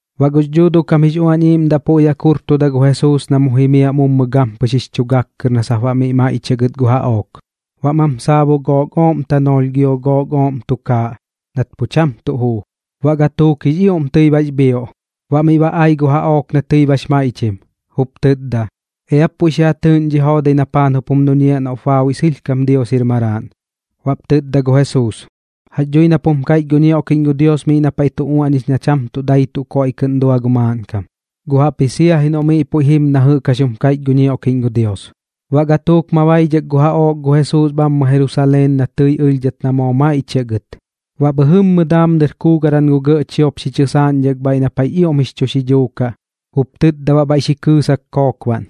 Baꞌ gux Dhuuduꞌ kam jix Uañ Iiꞌmdaꞌ puiꞌ jaꞌk xi jurtuda gu Jesuus na mu jimiaꞌ mummɨ gampɨx jix chu gak kɨr na sap baꞌ miꞌ maiꞌchiaꞌ gɨt gu jaꞌook. Baꞌ mam saabu gook ooꞌm tanoolh gio gook ooꞌm tukaaꞌ nat pu cham tuꞌ juu, baꞌ gatuuk jix ioꞌm tɨi bax bhioꞌ. Baꞌ miꞌ ba ai gu jaꞌook na tɨi bax maiꞌchim, jup tɨtda: ―Eap puiꞌ xi ja tɨɨꞌn dhi joodai na paan jup jum duñiaꞌ noꞌp baabuiꞌ sɨlhkam Dios jir Maraaꞌn. Baꞌp tɨtda gu Jesuus: ―Jax dhui nap jum kaiꞌch gu ñioꞌkiꞌñ gu Dios miꞌ na paiꞌ tu uaꞌñix na cham tuꞌ dai tuꞌ koiꞌ kɨꞌn dua gu maaꞌnkam, guꞌ jaꞌpji sia ji noꞌ miꞌ puiꞌ jim na jɨꞌk jax jum kaiꞌch gu ñioꞌkiꞌñ gu Dios. Baꞌ gatuuk ma baidhak gu jaꞌook gu Jesuus bhammɨ Jerusaleen na tɨi ɨlhdhat na ma maiꞌchiaꞌ gɨt. Baꞌ bhɨjɨmmɨ daam dɨr kuugaran gu gɇꞌ chiop xi chɨsaaꞌñdhak bhaiꞌ na paiꞌx ioꞌm jix chu xidhuu kaꞌ, jup tɨtda baꞌ bhaiꞌ xi kɨɨsak kookbaꞌn: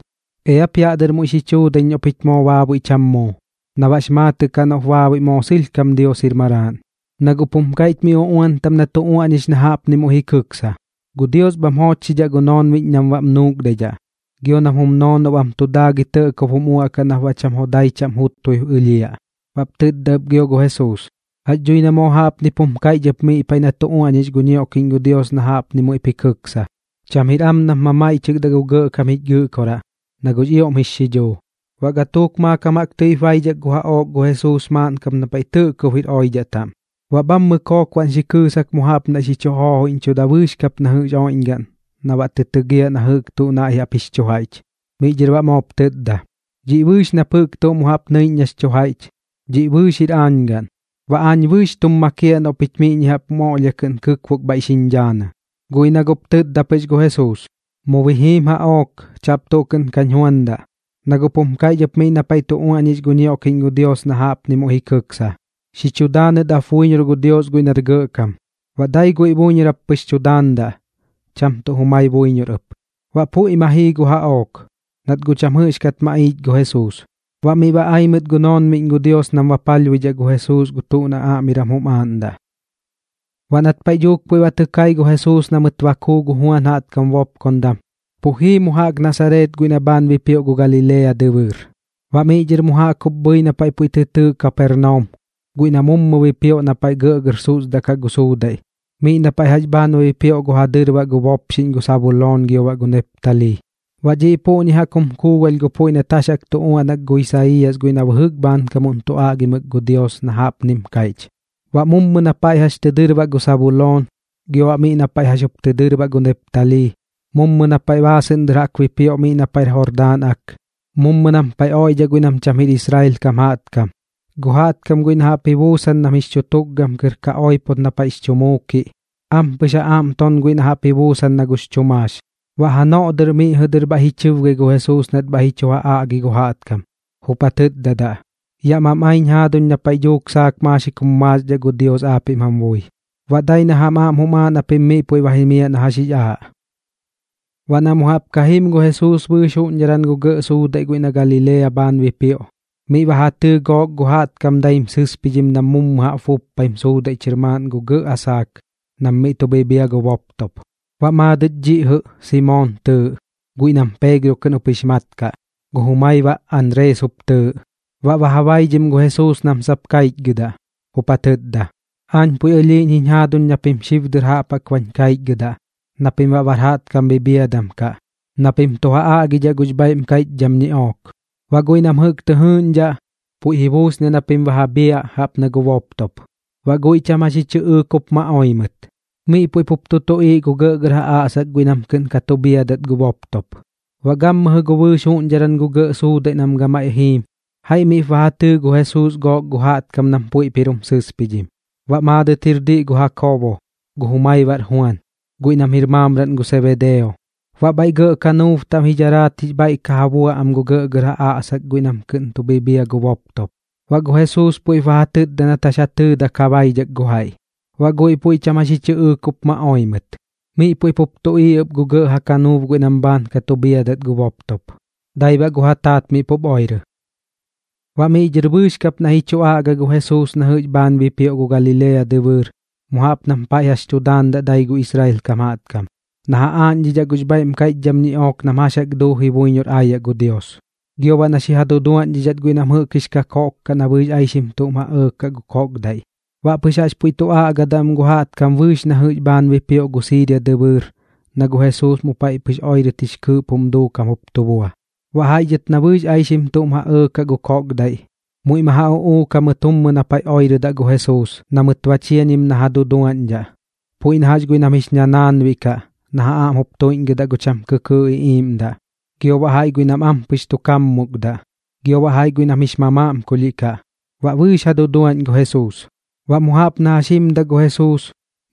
―Eap yaꞌ dɨr muiꞌ xi chuudaiñ noꞌ pich moo baabuiꞌ cham muu, na baꞌx maatɨꞌ kaꞌ noꞌp baabuiꞌ moo sɨlhkam Dios jir Maraaꞌn. Na guꞌp jum kaiꞌch miꞌ uꞌuan taꞌm na tu uaꞌñix na jaꞌpni muiꞌ jim kɨksa: Gu Dios bham joochxidhaꞌ gu noonbiꞌñ nam baꞌm nuukdaidhaꞌ, gio nam jum noonob am tu daagɨi tɇꞌkob jum uaꞌkaꞌ nap baꞌ cham jodai chaꞌm jutbui ɨlhiaꞌ. Baꞌp tɨtda ɨp gio gu Jesuus: ―Jax dhui na moo jaꞌpnip jum kaiꞌch ɨp miꞌ na paiꞌ tu uaꞌñix gu ñioꞌkiꞌñ gu Dios na jaꞌpni muiꞌ jim kɨksa: “Cham jir am nap mamaiꞌchɨkdaꞌ gu Gɇꞌkam jich Gɨꞌkoraꞌ, na guꞌx ioꞌm jix xidhuu.” Baꞌ gatuuk maakam jaꞌk tɨip baidhak gu jaꞌook gu Jesuus maaꞌn kap na paiꞌ tɇꞌkob jir oidhaꞌ taꞌm, baꞌ bhammɨ kookbaꞌn xi kɨɨsak mu jaꞌp naiꞌ xi chu joojoiꞌñchuda bɨɨx kap na jɨꞌx jir oiꞌñgaꞌn na baꞌ tɨ tɨgiaꞌ na jɨꞌk tuꞌ naiꞌ jaꞌp jix chu jaiꞌch. Miꞌ dhɨr baꞌ moop tɨtda: ―Dhiꞌ bɨɨx nap jɨꞌk tuꞌ mu jaꞌp nɨiꞌñ nax chu jaiꞌch, dhiꞌ bɨɨx jir aañ gaꞌn. Baꞌ aañ bɨɨx tum makiaꞌ noꞌ pich miꞌñi jaꞌp jum oꞌlhia kɨꞌn xi kɨkbok bhaiꞌ xiñ dhaanɨ. Guꞌ ji na guꞌp tɨtda pɨx gu Jesuus: ―Mu bi jim jaꞌook. Chaꞌp tuꞌ kɨꞌn kañ juandaꞌ. Na guꞌp jum kaiꞌch ɨp miꞌ na paiꞌ tu uaꞌñix gu ñioꞌkiꞌñ gu Dios na jaꞌpni muiꞌ jim kɨksa: “Xi chu daanɨt ap buiñor gu Dios guiꞌ nar gɇꞌkam. Baꞌ dai guiꞌ buiñor jap pɨx tu daandaꞌ, cham tuꞌ jumai buiñor ɨp.” Baꞌ puiꞌ ma jii gu jaꞌook, nat guꞌ cham jɨꞌxkat maꞌiich gu Jesuus. Baꞌ miꞌ ba ai mɨt gu noonbiꞌñ gu Dios nam baꞌ palhbuidhaꞌ gu Jesuus gu tuꞌ na aꞌmiram jum aaꞌndaꞌ. Baꞌ nat paiꞌ dhuuk puiꞌ ba tɨ kai gu Jesuus na mɨt ba kuu gu Juan jaꞌtkam bopkondam, pu jii mu jaꞌk Nasareet guiꞌ na bhaan bipioꞌ gu Galilea dɨbɨɨr. Baꞌ miꞌ dhɨr mu jaꞌk jup bhɨi na paiꞌ puiꞌ tɨ tɨɨꞌ Kapernaum guiꞌ na mummɨ bipioꞌ na paiꞌ gɇꞌgɇr susdaꞌkaꞌ gu suudaiꞌ, miꞌ na paiꞌ jax bhaan bipioꞌ gu ja dɨrbaꞌ gu bopxiꞌñ gu Sabuloon gio baꞌ gu Neptalii. Ba dhiꞌ puꞌñi jaꞌk jum kuugalh gu puiꞌ nat jax jaꞌk tu uaꞌnak gu Isaiiyas guiꞌ na bɨjɨk bhaankam tu aꞌgimɨk gu Dios na jaꞌpnim kaiꞌch: Baꞌ mummɨ na paiꞌ jax tɨ dɨrbaꞌ gu Sabuloon, gio baꞌ miꞌ na paiꞌ jax jup tɨ dɨrbaꞌ gu Neptalii, mummɨ na paiꞌ baasɨꞌn dɨr jaꞌk bipioꞌ miꞌ na paiꞌr Jordaan Ak, mummɨ nam paiꞌ oiꞌdhaꞌ guiꞌ nam cham jir Israel kam jaꞌtkam. Gu jaꞌtkam guiꞌ na jaꞌp ji buusan nam jix chu tukgam tɨr ka oipot na paiꞌx chu muukiꞌ, ampɨx ja aꞌm ton guiꞌ na jaꞌp ji buusan nax chu maax. Baꞌ janoꞌ dɨr miꞌ jɨꞌ dɨr bhaiꞌ ji chɨbgai gu Jesuus nat bhaiꞌ ji chu ja aꞌgi gu jaꞌtkam, jup ja tɨtdadaꞌ: ―Yaꞌ mam aiñ jaaduñ na paiꞌ dhuuk saak maaxik jum maaxdhaꞌ gu Dios aapiꞌm jam bui. Baꞌ dai na jam aꞌm jum aaꞌ na pim miꞌ puiꞌ ba jimiaꞌ na jax jix aaꞌ. Baꞌ na mu jaꞌp ka jim gu Jesuus bɨɨx juꞌñdharan gu gɇꞌ suudaiꞌ guiꞌ na Galilea bhaan bipioꞌ, baꞌ miꞌ ba ja tɨɨ gook gu jaꞌtkam daim sɨspidhim nam mu jaꞌp buppaim suudaiꞌ chɨr maaꞌn gu gɇꞌ asaak nam miꞌ tu bhibhia gu boptop. Baꞌ maadɨt dhiꞌ jɨꞌ Simoon tɨɨꞌ, guiꞌ nam Peegro kɨꞌn jup jix mat kaꞌ, gu jumaiꞌ baꞌ Anrees jup tɨɨꞌ. Baꞌ ba ja baidhim gu Jesuus nam sap kaichgɨdaꞌ, jup ja tɨtda: ―Aañ puiꞌ ɨlhiiꞌñ jiñ jaaduñ na pim xib dɨr jaꞌp jaꞌk bañ kaichgɨdaꞌ na pim baꞌ bar jaꞌtkam bhiadam kaꞌ, na pim tu ja aꞌgidhaꞌ gux bhaiꞌm kaiꞌchdham ñiꞌook. Baꞌ guiꞌ nam jɨꞌk tɨ jɨɨꞌñdhaꞌ, puiꞌ ji buusniaꞌ na pim ba ja bhiaꞌ jaꞌp na gu boptop. Baꞌ guiꞌ cham jax ji chɨꞌɨɨk jup ma oi mɨt. Miꞌ puiꞌ pup tu tuꞌiiꞌ gu gɇꞌgɇr ja aꞌsak guiꞌ nam kɨꞌn ka tu bhiadat gu boptop. Baꞌ gammɨjɨ gu bɨɨx juꞌñdharan gu gɇꞌ suudaiꞌ nam gamaiꞌ jiim, jaiꞌ miꞌp ba ja tɨɨ gu Jesuus gook gu jaꞌtkam nam puiꞌp jir jum sɨspidhim. Baꞌ maadɨt jir diꞌ gu Jakoobo, gu jumai baꞌr Juan, guiꞌ nam jir maamraꞌn gu Sebedeo. Baꞌ bhaiꞌ gɇꞌ kanuub taꞌm ji dharaat jix bhaiꞌ ka ja bua am gu gɇꞌgɇr ja aꞌsak guiꞌ nam kɨꞌn tu bhiadaꞌ gu boptop. Baꞌ gu Jesuus puiꞌp ba ja tɨtda nat jax ja tɨɨdak ja baidhak gu jaiꞌ. Baꞌ guiꞌ puiꞌ cham jax ji chɨꞌɨɨk jup ma oi mɨt. Miꞌ puiꞌ pup tuꞌiiꞌ ɨp gu gɇꞌ ja kanuub guiꞌ nam bhaan ka tu bhiadat gu boptop, dai baꞌ gu ja taat miꞌ pup oirɨ. Baꞌ miꞌ dhɨr bɨɨx kap naiꞌ ji chu aꞌga gu Jesuus na jɨꞌx bhaan bipioꞌ gu Galilea dɨbɨɨr mu jaꞌp nam paiꞌ jax tu daandaꞌ gu dai Israel kam jaꞌtkam, na ja aaꞌñdhidhaꞌ gux bhaiꞌm kaiꞌchdham ñiꞌook nam jax jaꞌk duuji buiñor aayaꞌ gu Dios, gio baꞌ na xi ja duduaꞌñdhidhat guiꞌ nam jɨꞌk jix kakoꞌk kaꞌ na bɨɨx aixim tuꞌm ja ɇɇkaꞌ gu koꞌkdaiꞌ. Baꞌ pɨx jaꞌx puiꞌ tu aꞌgadaꞌ am gu jaꞌtkam bɨɨx na jɨꞌx bhaan bipioꞌ gu Siiria dɨbɨɨr na gu Jesuus mu paiꞌ pɨx oirɨt jix kɨɨꞌp jum duukam jup tu bua. Baꞌ jaiꞌ dhɨt na bɨɨx aixim tuꞌm ja ɇɇkaꞌ gu koꞌkdaiꞌ, muiꞌ ma ja uꞌuuk jamɨt mummɨ na paiꞌ oirɨdaꞌ gu Jesuus na mɨt ba chiañim na ja duduaꞌñdhaꞌ, puiꞌ na jax guiꞌ nam jix ñanaanbiꞌ kaꞌ na ja aꞌm jup tuiꞌñgɨdaꞌ gu cham kɨkɨɨꞌ iꞌiiꞌmdaꞌ, gio baꞌ jaiꞌ guiꞌ nam ampɨx tu kaammukdaꞌ, gio baꞌ jaiꞌ guiꞌ nam jix mamaꞌmkulhiꞌ kaꞌ. Baꞌ bɨɨx ja duduaꞌñ gu Jesuus. Baꞌ mu jaꞌp na jax jimdaꞌ gu Jesuus,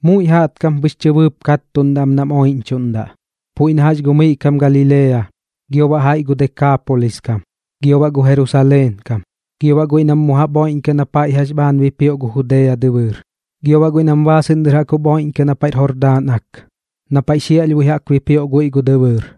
muiꞌ jaꞌtkam pɨx chɨbɨɨp kattuꞌndaꞌ am nam oiꞌñchuꞌndaꞌ, puiꞌ na jax gu miꞌ kam Galilea, gio baꞌ jaiꞌ gu Dekaapolis kam, gio baꞌ gu Jerusaleen kam, gio baꞌ guiꞌ nam mu jaꞌp jup oiꞌñkaꞌ na paiꞌ jax bhaan bipioꞌ gu Judea dɨbɨɨr, gio baꞌ guiꞌ nam baasɨꞌn dɨr jup oiꞌñkaꞌ miꞌ na paiꞌr Jordaan Ak, na paiꞌ xiaꞌlhbui jaꞌk bipioꞌ guiꞌ gu dɨbɨɨr.